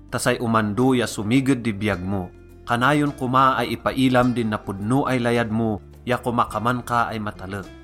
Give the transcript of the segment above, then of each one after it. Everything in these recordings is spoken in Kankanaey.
ta say omando ya somiged di biyag mo. Kanayon koma ay ipailam din napodno ay layad mo ya komakaman ka ay matalek.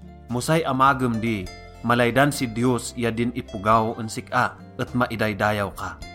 Mo say amagem di, malaydan si Diyos ya din ipogaw en sik-a et maidaydayaw ka.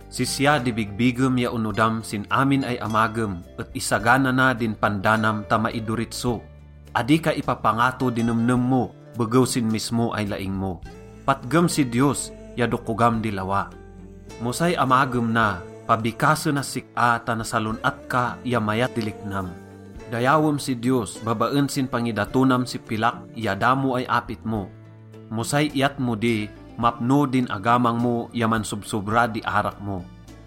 Sisya di bigbigem ya onodam sin amin ay amagem et isagana na din pandanam ta maidoritso. Adi ka ipapangato di nemnem mo begew sin mismo ay laing mo. Patgem si Diyos ya dokogam di lawa. Mo say amagem na, pabikasenas sik-a ta nasalon-at ka ya mayat di liknam. Dayawem si Diyos babaen sin pangidatonam si pilak ya damo ay apit mo. Mo say iyat mo di, mapno din agamang mo ya mansobsobra di arak mo.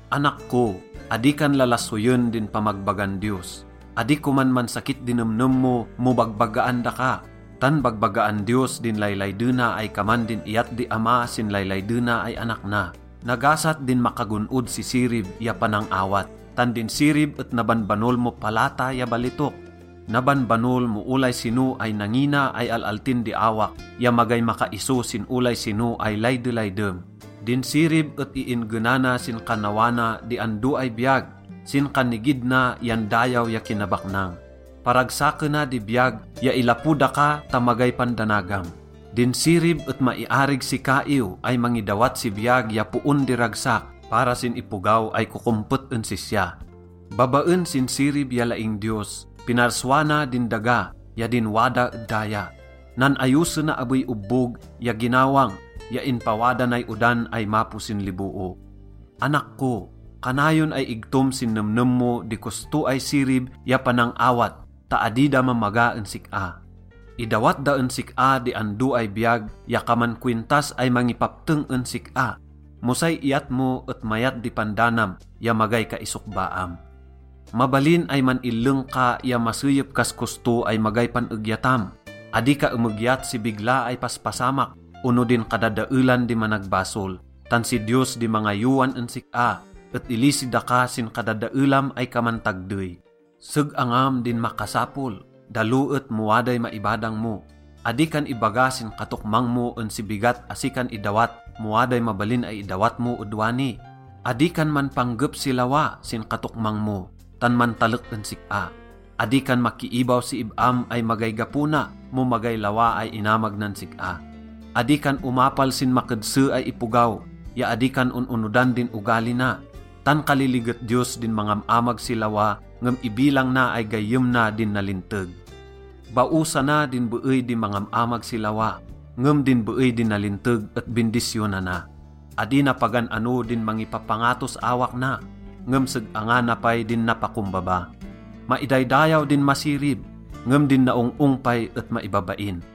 Anak ko, adi kan lalasoyen din pamagbagan Diyos. Adi koman mansakit di nemnem mo mo bagbagaan daka. Tan bagbagaan Diyos din laylaydena ay kaman din iyat di ama sin laylaydena ay anak na. Nagasat din makagon-od si sirib ya panang-awat. Tan din sirib et nabanbanol mo palata ya balitok. Nabanbanol mo olay sino ay nangina ay al-altin di awak ya magay makaiso sin olay sino ay laydelaydem. Din sirib et iin-genana sin kannawana di ando ay biyag, sin kannigid na yan dayaw ya kinabaknang. Paragsakena di biyag ya ilapo daka ta magay pandanagam. Din sirib et maiarig si kaiw ay mangidawat si biyag ya poon di ragsak para sin ipogaw ay kokompet en sisya. Babaen sin sirib ya laing Diyos, pinarsua na din daga ya din wada ed daya. Nan-ayosena abey obbog ya ginawang ya inpawada nay odan ay mapo sin liboo. Anak ko, kanayon ay igtom sin nemnem mo di kosto ay sirib ya panang-awat ta adi da mamaga en sik-a. Idawat da en sik-a di ando ay biyag ya kaman kowintas ay mangipapteng en sik-a. Mo say iyat mo et mayat di pandanam ya magay kaisokbaam. Mabalin ay man-illeng ka ya maseyep kas kosto ay magay pan-egyatam. Adi ka emegyat si bigla ay paspasamak ono din kadadaelan di managbasol, tan si Diyos di mangayowan en sik-a et ilisi daka sin kadadaelam ay kaman tagdey. Seg-angam din makasapol, dalo et mo waday maibadang mo. Adi kan ibaga sin katokmang mo en si bigat asi kan idawat mo waday mabalin ay idawat mo ed wani. Adi kan manpanggep si lawa sin katokmang mo, tan mantalek en sik-a. Adi kan makiibaw si ib-am ay magay gapo na mo magay lawa ay inamag nan sik-a. Adi kan omapal sin makedse ay ipogaw ya adi kan on-onodan din ogali na, tan kaliliget Diyos din mangam-amag si lawa, ngem ibilang na ay gayyem na din nalinteg. Baosana din beey di mangam-amag si lawa, ngem din beey di nalinteg et bindisyonana. Adi na pagan-ano din mangipapangatos awak na, ngem seg-angana pay din napakombaba. Maidaydayaw din masirib, ngem din naong-ong pay et maibabain.